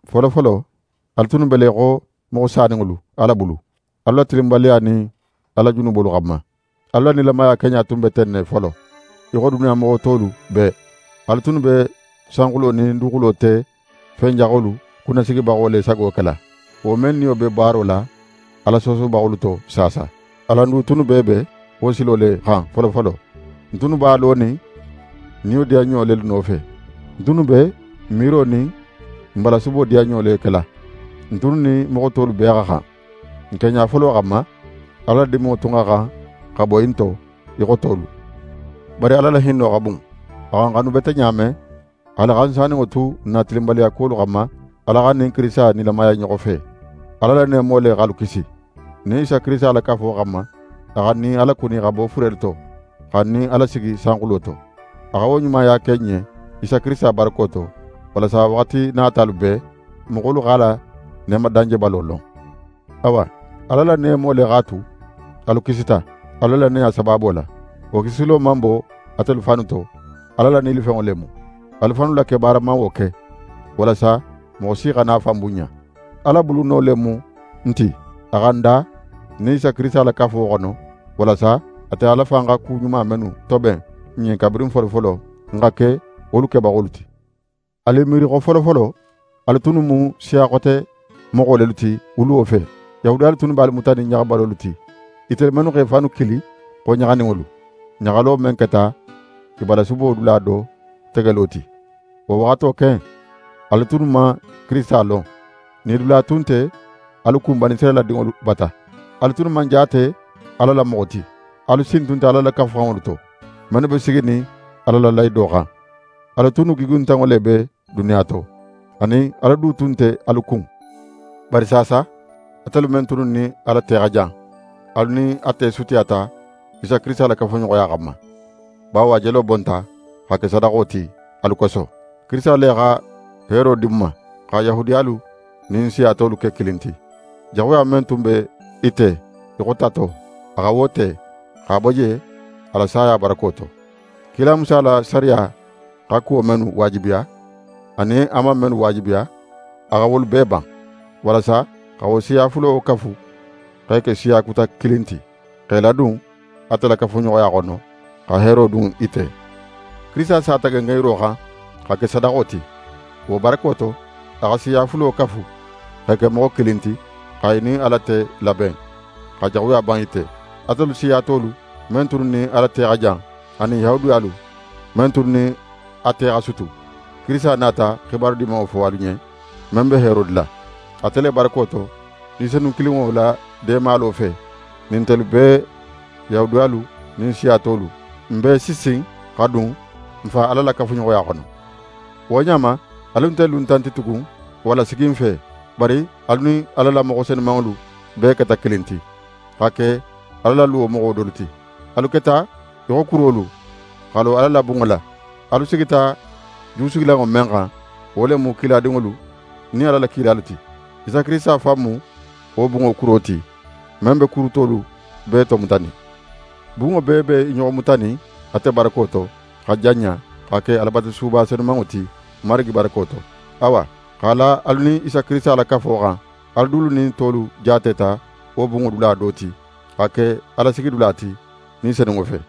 Folofolo, alu tunnu be le í xo moxo saninŋolu Ala bulu, alu la tilinbaliya nin alu la junubolu xanma. Alu la nilamaya keɲa tun be ten ne folo, í xo duniya moxo tolu bee. Alu tunnu be sanxulo nin duguxulo te fen jaxolu kunnasigibaxo le sago kela, wo men niyo be baaro la Ala soosobaxolu to saasa. Alan du tunnu bee be wo silo le xan folofolo. N tunnu b'a lonin n nidiyanɲo lelu nofe. N tunnu be n miiro nin n balasubo diyanɲo le kela. N tunnu nin moxo tolu bee xa xan. N keɲa folo xanma, Ala la diminŋo tun xa xan xa boyi n to í xo tolu. Bari Ala la hinno xa bun; a xa n xanu bete ɲa men, haali xa n saninŋo tu n na tilinbaliyalu xanma, Ala xa n nin Kirisita nilamaya i ɲoxo fe. Ala la neemo le x'alu kisi. N nin Isa Kirisita la kafo xanma, a xa n nin a lakuni xa bo furelu to, xa n nin a lasigi sanxulo to. A xa wo ɲumaya ke n ɲen Isa Kirisita barako to, walasa waxati natalu bee, moxolu x'a la neema danjebalo lon. Awa, Ala la neemo le x'a tu alu kisita, alu la lannaya sabaabo la. Wo kisilo man bo atelu fannu to; Ala la nilifenŋo le mu. Alu fannu la kebaara man wo ke; walasa moxo si xana a fan bunɲa. Ala buluno le mu n ti. A xa n da n nin Isa Kirisita la kafo xono, walasa ate Ala fan xa ku ɲuma mennu toben n ɲen kabirin folofolo, n xa ke wolu kebaxolu ti. Alu i miiri xo folofolo, alu tunnu mu siya xote moxo lelu ti wuluwo fe. Yahudiyalu tunnu be alu mutanin ɲaxabalolu ti, itelu mennu x'e fannu kili xo ɲaxaninŋolu, ɲaxalo men keta i balasubo dula do tegelo ti. Wo waxato ken, alu tunnu man Kirisita lon. Nidula tun nte alu kun Banisirayila dinŋolu bata. Alu tunnu man jaate Ala la moxo ti. Alu sin tun nte Ala la Kafuxanŋolu to, mennu be siginin Ala la lahido xan. Alu tunnu gigintanŋo le be duniya to, anin, Ala du tun nte alu kun. Bari saasa, atelu men tunnu nin Ala te xa jan, alu nin a te sutiyata Isa Kirisita la kafuɲoxoya xanma; bawo a jelo bonta xa ke sadaxo ti alu koso. Kirisita le xa heero di n ma, xa Yahudiyalu nin siya tolu ke kilin ti. Jaxuya men tun be i te í xo tato, a xa wo te, x'a bo je a la saya barako to. Kila Musa la sariya xa kuwo mennu waajibiya, anin a man mennu waajibiya, a xa wolu bee ban; walasa xa wo siya fulo kafu x'e ke siya kuta kilin ti, x'e ladun ate la kafuɲoxoya xono, xa heero dun i te. Kirisita sata gengenyiro xan xa ke sadaxo ti. Wo barako to, a xa siya fulo kafu, x'e ke moxo kilin ti, xa i nin Ala te laben, xa jaxuya ban i te. Atelu siya tolu men tunnu nin Ala te xa jan, anin Yahudiyalu men tunnu nin a te xa sutu, Kirisita nata xibaru Dimanŋo fo alu ɲen, men be heero dila. Ate le barako to, Ni Senun kilinŋo la deemalo fe, nin ntelu bee, Yahudiyalu nin siya tolu, n bee si sin xa dun n Fa Ala la kafuɲoxoya xono. Wo ɲa ma, alu nte luntan ti tugun walla siginfe; bari alu nin Ala la moxo senumanŋolu bee keta kilin ti, xa ke Ala la luwo moxo dolu ti. Alu keta í xo kurolu, xa lo Ala la bunŋo la. Alu sigita jusigilanŋo men xan, wo le mu kiladinŋolu nin Ala la kilalu ti. Isa Kirisita fan mu wo bunŋo kuro ti, men be kuru tolu bee tomutanin. Bunŋo bee be i ɲoxo mutanin ate barako to, xa janɲa, xa ke Alabatusuba senumanŋo ti, Marigi barako to. Awa, x'a la alu nin Isa Kirisita la kafo xan, alu dulu nin tolu jaateta wo bunŋo dula do ti, xa ke Ala sigidula ti, Ni Senunŋo fe.